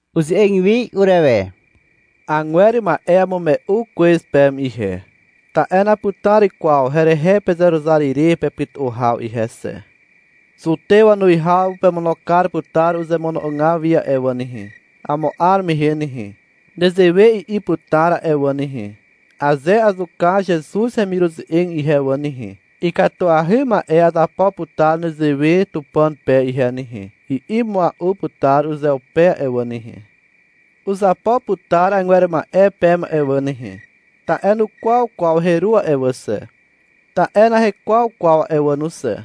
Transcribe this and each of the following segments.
Uze'eg wi urewe. Agwer ma'e amume'u kwez peme ihe, ta'e naputar kwaw herehe pezeruzar ire pepytu'u haw ihe xe. Zutew wanuwihaw pemono kar putar uzemono'ogaw wi a'e wà nehe. Amo 'ar mehe nehe, nezewe i'i putar a'e wà nehe. — Aze azuka Zezuz hemiruze'eg ihe wà nehe, ikatuahy ma'e azapo putar nezewe Tupàn pe ihe nehe, i'i mua'u putar uzeupe a'e wà nehe. Uzapo putar agwer ma'e peme a'e wà nehe, ta'e nukwaw kwaw heru a'e wà xe, ta'e nahekwaw kwaw a'e wà no xe.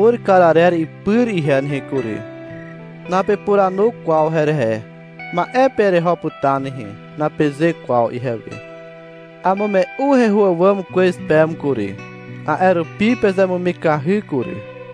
Aha putar hemur kar arer ipyr ihe nehe kury. Napepuranu kwaw herehe. — Ma'e pe ereho putar nehe, napeze kwaw ihewe. Amume'u heho àwàm kwez peme kury. A'e rupi pezemumikahy kury.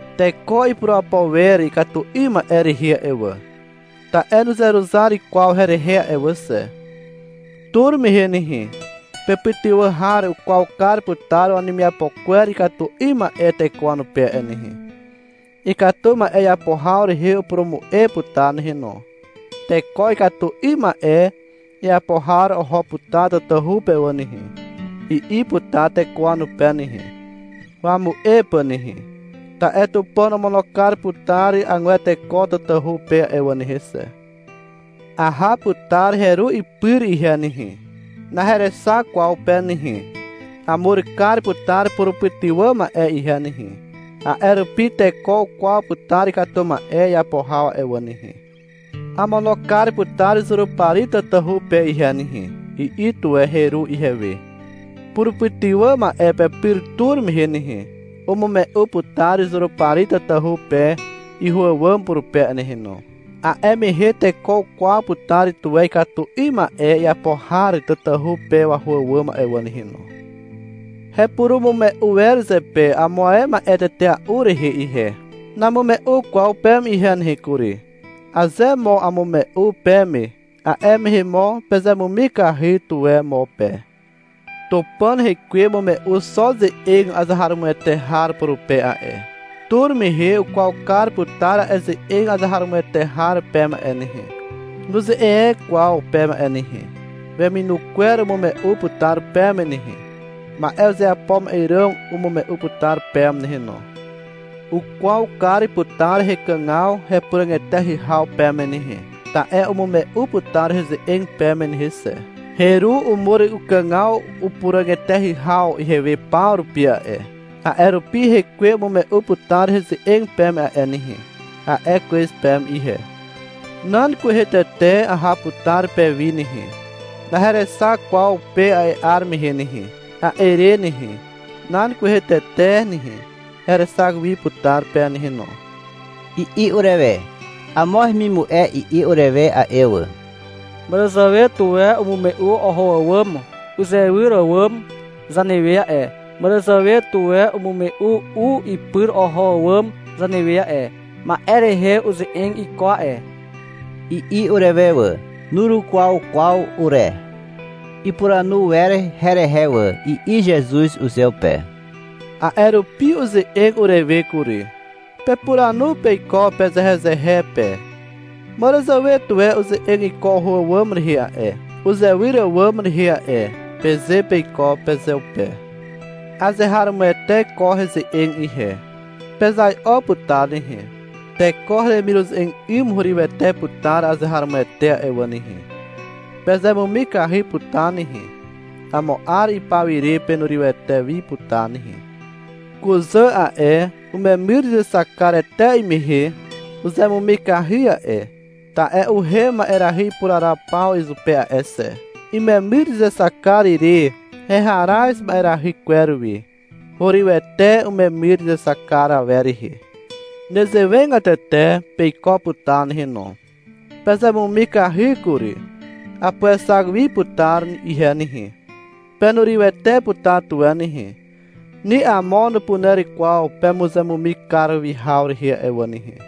Teko ipurapo wer ikatu 'ym ma'e rehe a'e wà, ta'e nuzeruzar kwaw herehe a'e wà xe. Tur mehe nehe pepytywà har ukwaw kar putar wanemiapo kwer ikatu 'ym ma'e teko wanupe a'e nehe. Ikatu ma'e iapo haw rehe upurumu'e putar nehe no. — Teko ikatu 'ym ma'e iapo har oho putar tatahu pe wà nehe, i'i putar teko wanupe nehe, wamu'e pà nehe. Ta'e Tupàn omono kar putar agwer teko tatahu pe a'e wà nehe xe. Aha putar heru ipyr ihe nehe. Naherexak kwaw pe nehe. Amur kar putar purupytywà ma'e ihe nehe. A'e rupi teko ukwaw putar ikatu ma'e iapo haw a'e wà nehe. — Amono kar putar Zurupari tatahu pe ihe nehe, i'i tuwe heru ihewe. Purupytywà ma'e pepyr tur mehe nehe, umume'u putar Zurupari tatahu pe iho àwàm purupe a'e nehe no. A'e mehe teko ukwaw putar tuwe ikatu 'ym ma'e iapo har tatahu pe waho àwàm a'e wà nehe no. Hepurumume'u wer zepe amo ae ma'e tetea'u rehe ihe. Namume'u kwaw peme ihe nehe kury. Aze mo amume'u peme, a'e mehe mo pezemumikahy tuwe mo pe. Tupàn rekwe umume'u xo ze'eg azeharomoete har purupe a'e. Tur mehe ukwaw kar putar a'e ze'eg azeharomoete har peme a'e nehe. Nuze'eg e kwaw peme a'e nehe. Weminu kwer umume'u putar peme nehe. Ma'e uzeapo ma'e ràm umume'u putar peme nehe no. Ukwaw kar putar hekàgaw hepuràg eteahy haw peme nehe, ta'e umume'u putar heze'eg peme nehe xe. Heru umur ukàgaw upuràg eteahy haw ihewe paw rupi a'e. A'e rupi — Hekwe umume'u putar heze'eg peme a'e nehe, a'e kwez peme ihe. — Nan kwehe tete aha putar pewi nehe. Naherexak kwaw pe a'e 'ar mehe nehe. A'e re nehe, nan kwehe tete nehe, herexak wi putar pe nehe no, i'i urewe. Amo hemimu'e i'i urewe a'e wà. — Màràzàwe tuwe umume'u oho àwàm uzewyr àwàm zanewe a'e, màràzàwe tuwe umume'u u ipyr oho àwàm zanewe a'e. Ma'e rehe uze'eg iko a'e, i'i urewe wà. Nurukwaw kwaw ure. — Ipuranu wer herehe wà, i'i Zezuz uzeupe. A'e rupi uze'eg urewe kury. — Pepuranu peiko pezehezehe pe, — Màràzàwe tuwe uze'eg iko oho àwàm rehe a'e, uzewyr àwàm rehe a'e, peze peiko pezeupe. Azeharomoete ko heze'eg ihe. Pezai'o putar nehe. Teko heremiruze'eg 'ym hurywete putar azeharomoete a'e wà nehe. Pezemumikahy putar nehe. Amo 'ar ipaw ire penurywete wi putar nehe. Kuzà a'e, umemyr izexak kar etea'i mehe uzemumikahy a'e, ta'e uhem ma'erahy ipuraraw paw izupe a'e xe. Imemyr izexak kar ire heharaz ma'erahy kwer wi. Hurywete umemyr izexak kar awer rehe. Nezewegatete peiko putar nehe no. Pezemumikahy kury. Apuexak wi putar ihe nehe. Penurywete putar tuwe nehe. Ni amo nupuner kwaw pemuzemumikahy kar wi haw rehe a'e wà nehe.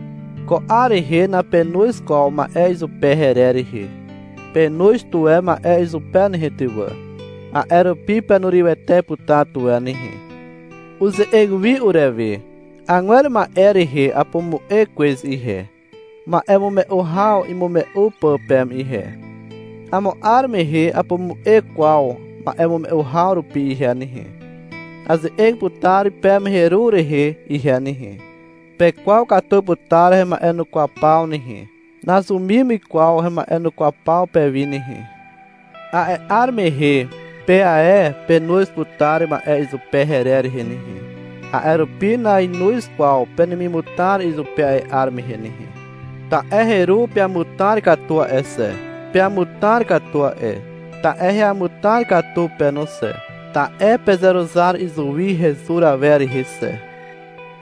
Ko 'ar rehe napenoz kwaw ma'e izupe herer rehe. Penoz tuwe ma'e izupe nehe ty wà. A'e rupi penurywete putar tuwe nehe. Uze'eg wi urewe. — Agwer ma'e rehe apumu'e kwez ihe, ma'emume'u haw imume'u pà peme ihe. Amo 'ar mehe napumu'e kwaw ma'emume'u haw rupi ihe nehe. Aze'eg putar peme heru rehe ihe nehe. Pekwaw katu putar hema'enukwaw paw nehe. Nazumim kwaw hema'enukwaw paw pewi nehe. A'e 'ar mehe pe ae penoz putar ma'e izupe herer rehe nehe. A'e rupi nainoz kwaw penemimutar izupe a'e 'ar mehe nehe. Ta'e heru peamutar katu a'e xe. Peamutar katu a'e, ta'e heamutar katu pe no xe, ta'e pezeruzar izuwi hezur awer rehe xe.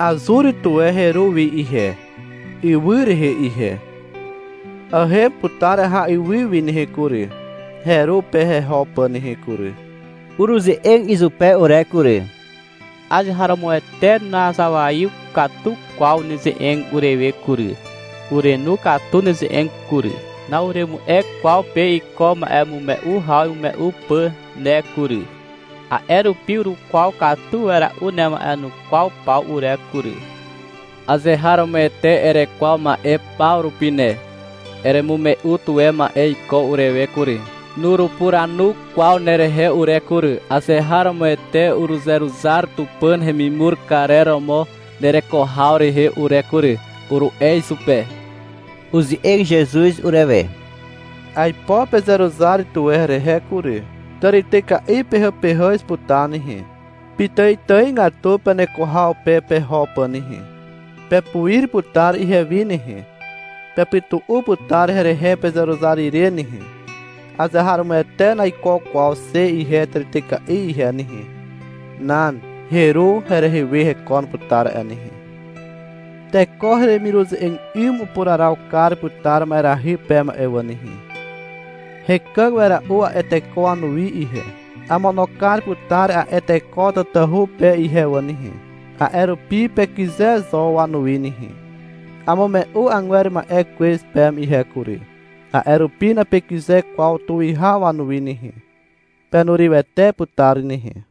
Azur tuwe heru wi ihe, ywy rehe ihe. Ahem putar aha ywy wi nehe kury, heru pe heho pà nehe kury. Uruze'eg izupe ure kury. — Azeharomoete nazawaiw katu kwaw neze'eg urewe kury. (Urenu katu neze'eg kury.) Na'uremu'e kwaw pe iko ma'emume'u haw imume'u pà ne kury. A'e rupi urukwaw katu wera'u nema'enukwaw paw ure kury. Azeharomoete erekwaw ma'e paw rupi ne. Eremume'u tuwe ma'e iko urewe kury. Nurupuranu kwaw nerehe ure kury. Azeharomoete uruzeruzar Tupàn hemimur karer romo nereko haw rehe ure kury, uru'e izupe. Uze'eg Zezuz urewe. — Aipo pezeruzar tuwe herehe kury. Tàrityka'i pehàpehàz putar nehe, pitàitàigatu peneko haw pe peho pà nehe. Pepuir putar ihewi nehe. Pepytu'u putar herehe pezeruzar ire nehe. Azeharomoete naiko kwaw xe ihe zutyka'i ihe nehe. Nan. Heru herehe we hekon putar a'e nehe. Teko heremiruze'eg 'ym upuraraw kar putar ma'erahy peme a'e wà nehe. Hekàg wera'u a'e teko wanuwi ihe. Amono kar putar a'e teko tatahu pe ihe wà nehe. A'e rupi pekyze zo wanuwi nehe. Amume'u agwer ma'e kwez peme ihe kury. A'e rupi napekyze kwaw tuwihaw wanuwi nehe. Penurywete putar nehe.